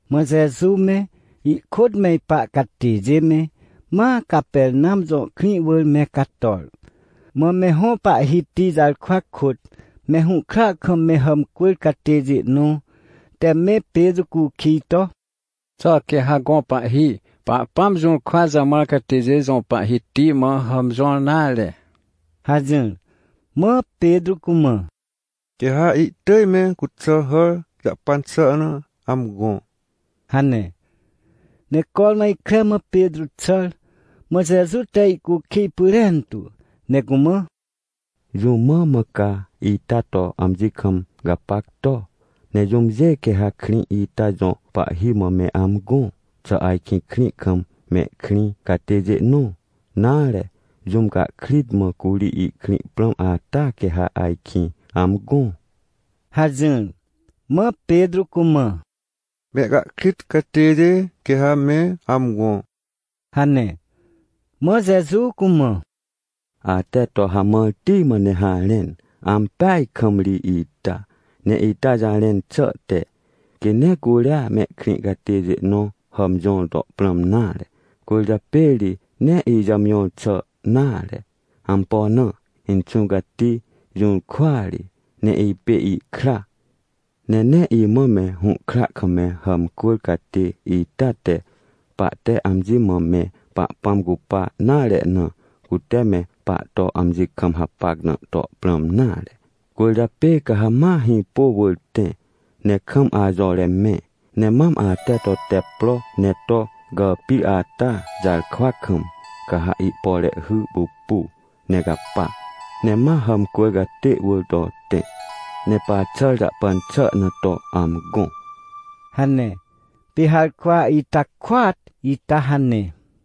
Mã Jeju me, ihkôt me ipa catêjê me, ma Capernam jõ krĩ wỳr me cator. Mã me hõ pahhiti jarkwa kôt me hũhkra kam me hàmcwỳr catêjê nõ te me Petrô cukij to: — Xà quê ha gõ pahhi, Pahpãm jũrkwa jamãr catêjê jõ pahhiti mã hàmjõr nare? — hajỹr. Mã Petrô cumã: — Quê ha ihtỳj me cuxà hàr jahpan xà na amgõ — hane. Ne cormã ikre mã Petrô xàr, mã Jeju te ihcukij pyrentu, ne cumã: — Jũ mã mã ca ita to amji kam gapac to? Ne jũmjê quê ha krĩ ita jõ pahhi mã me amgõ? Xà ajkĩ krĩ kam mehkrĩ catêjê nõ, nare, jũm cahkrit mã curi ihkrĩ prãm ata quê ha ajkĩ amgõ? — hajỹr. Mã Petrô cumã: — Mehcahkrit catêjê quê ha me amgõ — hane. Mã Jeju cumã: — Ate to hamãrti mã ne harẽn, ampeaj kam ri ita! Ne ita jarẽn xà te, quê nee curia mehkrĩ catêjê nõ hàmjõr to prãm nare. Cwỳrjapê ri nee ijàmjõr xà nare. Ampo na? Inxũ Cati jũrkwa ri, ne ipê ihkra. — Ne nee imã me hũhkra kam me hàmcwỳr catê ita te, pahte amji mã me Pahpãm cupa nare na, cute me pahto amji kam hapac na to prãm nare. Cwỳrjapê ca ha ma hĩpô wỳr tẽ ne kam ajore mẽ. Ne mam ate to tep pro ne to gàpir ata jarkwa kam, ca ha ihpore hy pupu ne capa, ne ma hàmcwỳr catê wỳr to tẽ, ne paxàr jahpan xà na to amgõ — hane. Pê harkwa ita kôat ita hane.